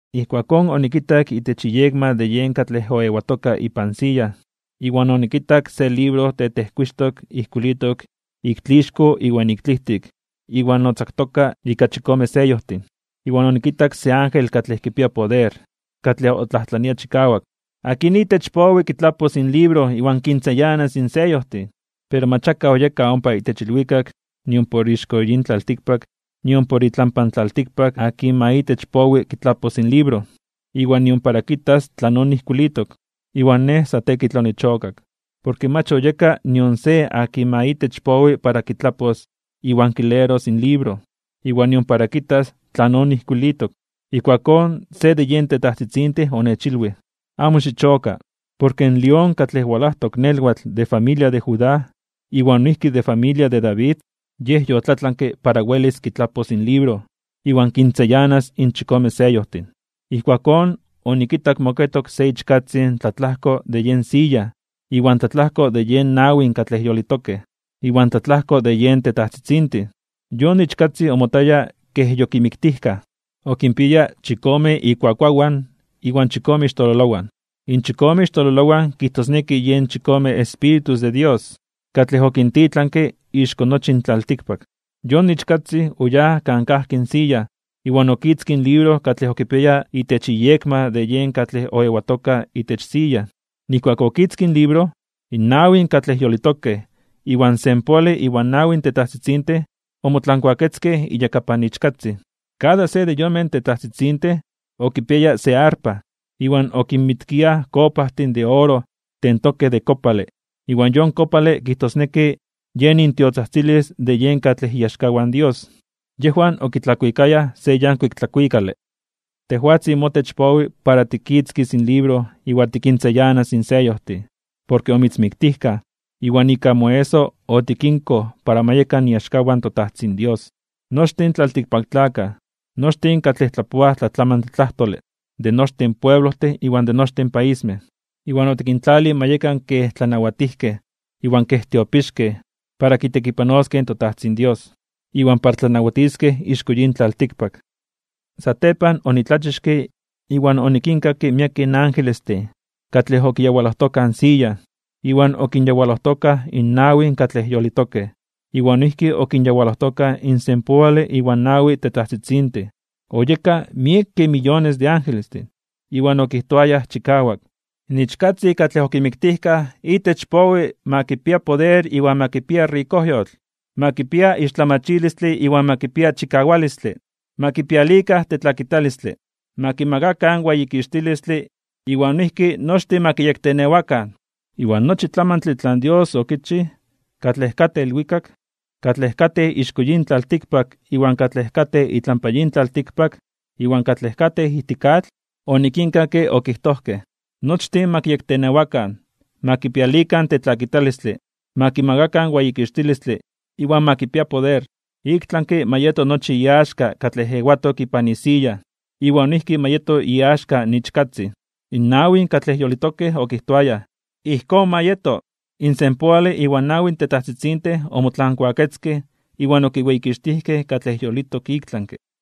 Ijkuakón onikitak itech iyekma de yen katlej oewatoka ipan siya, iwan onikitak se libro tetejkuixtok ijkuilitok ik tlixko iwan ik tlijtik iwan otzaktoka ika chikome seyojtin. Iwan onikitak se ángel katlej kipia poder katlej otlajtlania chikawak: ―¿Akin itech powi kitlapos in libro iwan kintzayanas in seyojtin? Pero mach akaj oyeka ompa itech ilwikak nimpor ixko yin tlaltikpak nimpor itlampa in tlaltikpak akin ma itech powi kitlapos in libro, iwan nion para kitas tlanon ijkuilitok. Iwan nej sa tekitl onichokak, porke mach oyeka nion se akin ma itech powi para kitlapos iwan kileros in libro, iwan nion para kitas tlanon ijkuilitok. Ijkuakón se de yen tetajtzitzintin onechilwij: ―Amo xichoka, porke in lión katlej walajtok nelwatl de familia de Judá iwan noijki de familia de David, Yej yotlatlanke para welis kitlapos in libro iwan kintzayanas in chikome seyojtin. Ijkuakón onikitak moketok se Ichkatzin tlatlajko de yen siya iwan tlatlajko de yen nawin katlej yolitokej, iwan tlatlajko de yen tetajtzitzintin. Yon Ichkatzin omotaya kej yokimiktijkaj. Okinpiaya chikome ikuakuawan iwan chikome ixtololowan. In chikome ixtololowan kijtosneki yen chikome espíritus de Dios katlej okintitlankej ixko nochi in tlaltikpak. Yon Ichkatzin oyáj kan kajki in siya, iwan okitzkij in libro katlej okipiaya itech iyekma de yen katlej oewatoka itech siya. Nijkuak okitzkij in libro, in nawin katlej yolitokej iwan senpoale iwan nawi tetajtzitzintin, omotlankuaketzkej iyakapan Ichkatzin. Kada se de yonmej tetajtzitzintin okipiaya se arpa, iwan okinmitkiaj kopajtin de oro tentokej de kopale, iwan yon kopale kijtosneki yen intiotzajtzilis de yen katlej iaxkawan in Dios. Yejwan okitlakuikayaj (okuikayaj) se yankuik tlakuikale: Tejwatzin motech powi para tikitzkis in libro iwan tikintzayanas in seyojtin. Porke omitzmiktijkaj, iwan ika moeso otikinkoj para ma yekan iaxkawan in toTajtzin Dios, nochtin in tlaltikpaktlakaj, nochtin katlej tlapoaj tlatlamantle tlajtole, de nochtin pueblojtin, iwan de nochtin paismej. Iwan otikintlalij ma yekan kej tlanawatijkej iwan kej tiopixkej para kitekipanoskej in toTajtzin Dios, iwan para tlanawatiskej ixko yin tlaltikpak. Satepan onitlachixke iwan onikinkakke miekej angelestin katlej okiyawalojtokaj in siya, iwan okinyawalojtokaj in nawin katlej yolitokej, iwan noijki okinyawalojtokaj in senpoale iwan nawi tetajtzitzintin. Oyekaj miekej miyones de angelestin. Iwan okijtoayaj chikawak: In Ichkatzin katlej okimiktijkaj itech powi ma kipia poder iwan ma kipia rikojyotl, ma kipia ixtlamachilistle iwan ma kipia chikawalistle, ma kipialikan tetlakitalistle, ma kimakakan weyikixtilistle iwan noijki nochtin ma kiyektenewakan. Iwan nochi tlamantle tlan Dios okichij, katlej katej ilwikak, katlej katej ixko yin tlaltikpak iwan katlej katej itlampa yin tlaltikpak, iwan katlej katej ijtik atl, onikinkakke okijtojkej: Nochtin ma kiyektenewakan, ma kipialikan tetlakitalistle, ma kimakakan weyikixtilistle iwan ma kipia poder, iktlanke (ik tlami) ma yeto nochi iaxka katlej ewatok ipan isiya iwan noijki ma yeto iaxka in Ichkatzin. In nawin katlej yolitokej okijtoayaj: ―¡Ijkón ma yeto! In senpoale iwan nawi tetajtzitzintin omotlankuaketzkej iwan okiweyikixtijkej katlej yolitok iktlanke (ik tlami).